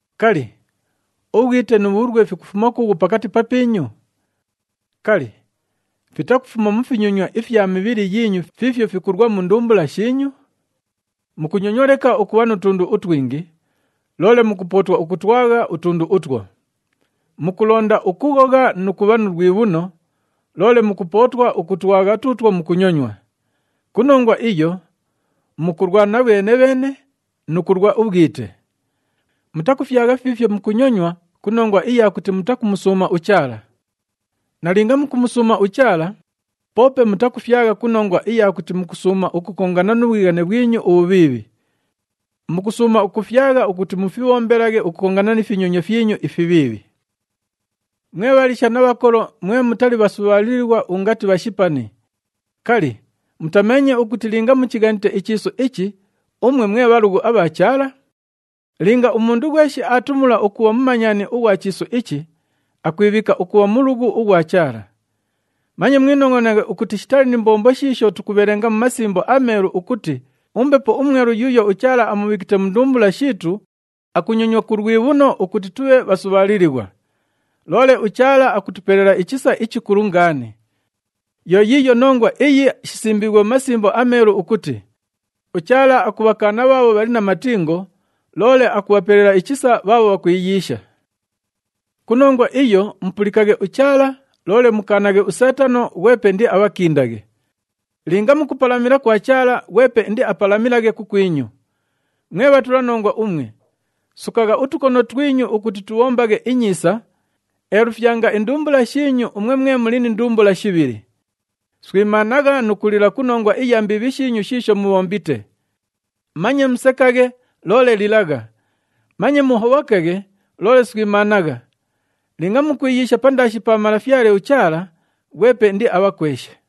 Kali, ubhwite nu bhulwe fikufuma kuughu pakati papiinyu? Kali, fitakufuma mu finyonywa ifya mibhili yiinyu fiifyo fikulwa mu ndumbula shiinyu? Mukunyonywa leka ukubha nu tundu utwingi, loole mukupootwa ukutwagha utundu utwo. Mukulonda ukughogha nu kubha nu lwibhuno, loole mukupootwa ukutwagha tuutwo mukunyonywa. Ku nongwa iyo, mukulwana bheene-bheene nu kulwa ubhwite. Mutakufyagha fiifyo mukunyonywa ku nongwa iya kuti mutakumusuuma uChaala. Nalinga mukumusuuma uChaala, poope mutakufyagha ku nongwa iya kuti mukusuuma ukukongana nu bhwighane bhwinyu ubhubhiibhi. Mukusuuma ukufyagha ukuti mufibhombelaghe ukukongana ni finyonywa fyinyu ifibhiibhi. Mwe bhaliisha na bhakolo mwe mutali bhasubhaalilighwa ungati bhashipani, kali, mutameenye ukuti linga muchighanite ichiisu ichi, umwe mwe bhalughu abha Chaala? Linga umundu ghweshi aatumula ukubha mumanyani ughwa chiisu ichi, akwibhiika ukubha mulughu ughwa Chaala. Manye mwinongʼonaghe ukuti shitali ni mbombo shiisho tukubhelenga mu Masimbo aMeelu ukuti uMbepo uMwelu yuuyo uChaala amubhiikite mu ndumbula shiitu akunyonywa ku lwibhuno ukuti tubhe bhasubhaalilighwa. Loole uChaala akutupelela ichisa ichikulu ngaani. Yo yiiyo nongwa iyi shisimbiighwe mu Masimbo aMeelu ukuti, “UChaala akubhakaana bhaabho bhali na matingo, loole akubhapelela ichisa bhaabho bhakwiyiisha.” Ku nongwa iyo mupulikaghe uChaala, loole mukaanaghe uSeetano, ghwepe indiabhakindaghe. Linga mukupalamila kwa Chaala, ghwepe indiapalamilaghe kukwinyu. Mwe bhatulanongwa umwe, sukagha utukono twinyu ukuti tubhombaghe inyiisa, eelufyanga indumbula shiinyu umwe mwe muli ni ndumbula shibhili. Swimaanagha nu kulila ku nongwa iya mbiibhi shiinyu shiisho mubhombite. Manye musekaghe, loole lilagha, manye muhobhokaghe, loole swimaanagha. Linga mukwiyiisha pandaashi pa Malafyale uChaala, ghwepe indiabhakweshe.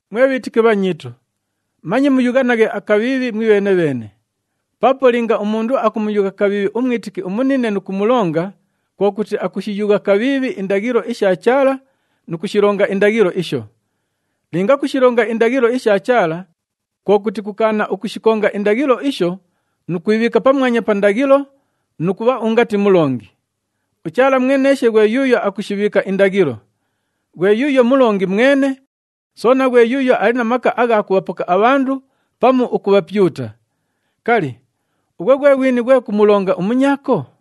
Mwe bhiitiki bhanyiitu, manye muyughanaghe akabhiibhi mwibheene-bheene. Paapo linga umundu akamuyugha kabhiibhi umwitiki umunine nu kumulonga, kwo kuti akushiyugha kabhiibhi indaghilo isha Chaala nu kushilonga indaghilo isho. Linga kushilonga indaghilo isha Chaala, kwo kuti kukaana ukushikonga indaghilo isho nu kwibhiika pamwanya pa ndaghilo nu kubha ungati mulongi. UChaala mweneeshe ghwe yuuyo akushibhiika indaghilo, ghwe yuuyo Mulongi mwene, soona ghwe yuuyo ali na maka agha kubhapoka abhandu pamu ukubhapyuta. Kali, ughwe ghwe ghwini ghwe kumulonga umunyaako?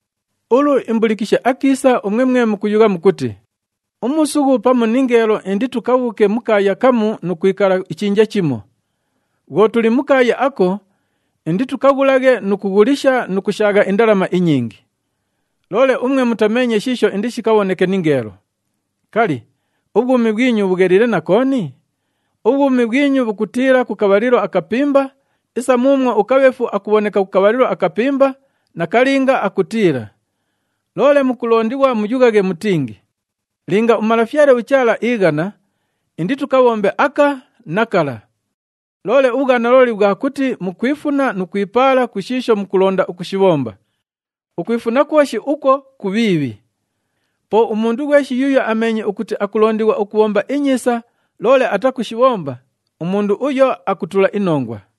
Ulu, imbulikishe akiisa umwe mwe mukuyugha mukuti, “Umuusughu pamu ningeelo inditukabhuuke mu kaaya kamu nu kwikala ichinja chimo. Bhwo tuli mu kaaya ako, inditukaghulaghe nu kughulisha nu kushaagha indalama inyingi.” Loole umwe mutameenye shiisho indishikabhoneke ningeelo! Kali, ubhwumi bhwinyu bhugheliile na kooni? Ubhwumi bhwinyu bhukutiila ku kabhalilo akapimba isa muumwo ukabheefu akubhoneka ku kabhalilo akapimba nakalinga akutiila! Loole mukulondighwa muyughaghe mutingi, “Linga uMalafyale uChaala iighana, inditukabhombe aka na kala.” Loole ubhwanalooli bhwa kuti mukwifuna nu kwipaala ku shiisho mukulonda ukushibhomba. Ukwifuna kwoshi ukwo kubhiibhi. Po umundu ghweshi yuuyo ameenye ukuti akulondighwa ukubhomba inyiisa, loole atakushibhomba, umundu uyo akutula inongwa.